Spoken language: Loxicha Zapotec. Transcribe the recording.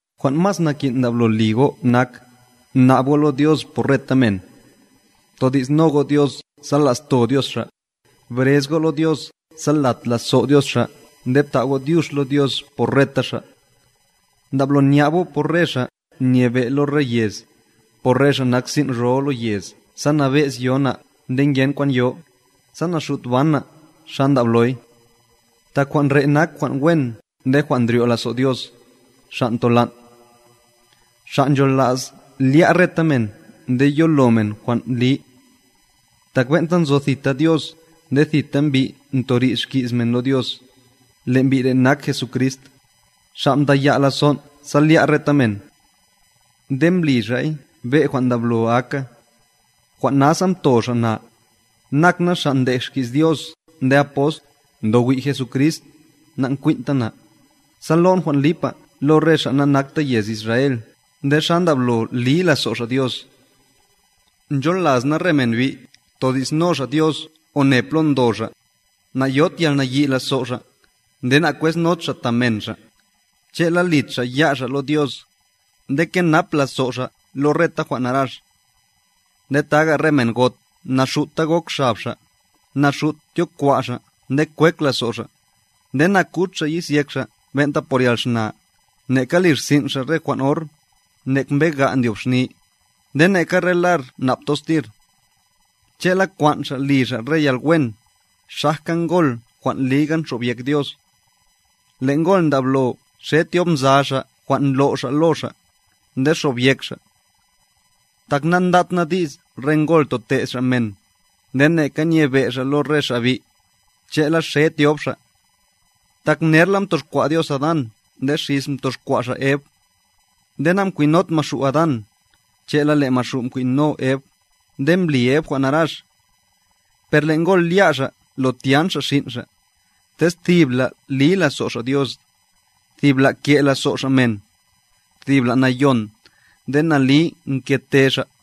Jwan' mas nakin' ndablo li go' nak, mna'b go' lo Dios por reta men. Btodi'sno go' Dios sa la'sto Dios xa', brez go' lo Dios sa lat lazo' Dios xa' nde bta' go' dyux lo Dios por reta xa'. Ndablo nya'b go' por re xa' nyebe' lo re yez', por re xa' nak sin' ro lo yez sa nabe'z yo na' nde ngenkwan yo, sa naxut ban na' xa nda'bloy. Tak jwan' re' nak jwan' wen nde jwan' ndryo' lazo' Dios, Xa' ntolan', Xa' nchola's lya' reta men nde yolo men jwan' li. Tak ben'ta nzo thita Dios nde thita mbi' ntorid xki's men lo Dios, le' mbi' re' nak Jesucrist, Xa' mda'ya' lazon' sa lya' reta men. Nde mbli Xa'y be' jwan' ndablo aka. Jwan' nasa mto Xa' na, nak na xa' ndej xki's Dios nde apost (ndowi' Jesucrist, nankwi'nta na) sa lo'n jwan' lipa' lo re xa' nanakta yez Israel nde xa ndablo li lazo' xa' Dios. Ncholas na reta men bi' todi'sno xa' Dios one plo ndo xa', nayod yalnayi' lazo' xa', nde nakwesnod xa' ta men xa', che'la lit xa' ya' xa' lo Dios, nde kenap lazo' xa' lo reta jwan' narax. Nde taga' re men got naxu'ta gok xab xa', naxut tyokwa' xa' nde kwek lazo' xa';a nde naku'd xa' yisyek xa' ben'ta por yalxna, neka li rsin' xa' jwan' or, nek mbega' ndyob xnib, nde neka re lar naptoztir. Che'la kwan' xa' li xa' re yalwen, xajka ngol jwan' liga nxob yek Dios. Le' ngol ndablo xe tyob nza xa' jwan' ndlo' xa' lo xa', nde xobyek xa'. Tak nandat na di's re ngol tote'd xa' men, nde neka nyebe' xa' lo re xa' bi', che'la xe tyob xa'. Tak nerla mtoxkwa' Dios Adán nde xis mtoxkwa' Xa' Ev. Nde namkwinod Maxu' Adan, che'la le' Maxu' mkwin'no Ev, nde mbli Ev jwan' narax. Per le' ngol lya' xa' lo tyan xa' xin' xa', tez thibla li lazo' xa' Dios, thibla ke' lazo' xa' men, thibla nayon nde nali nkete xa'.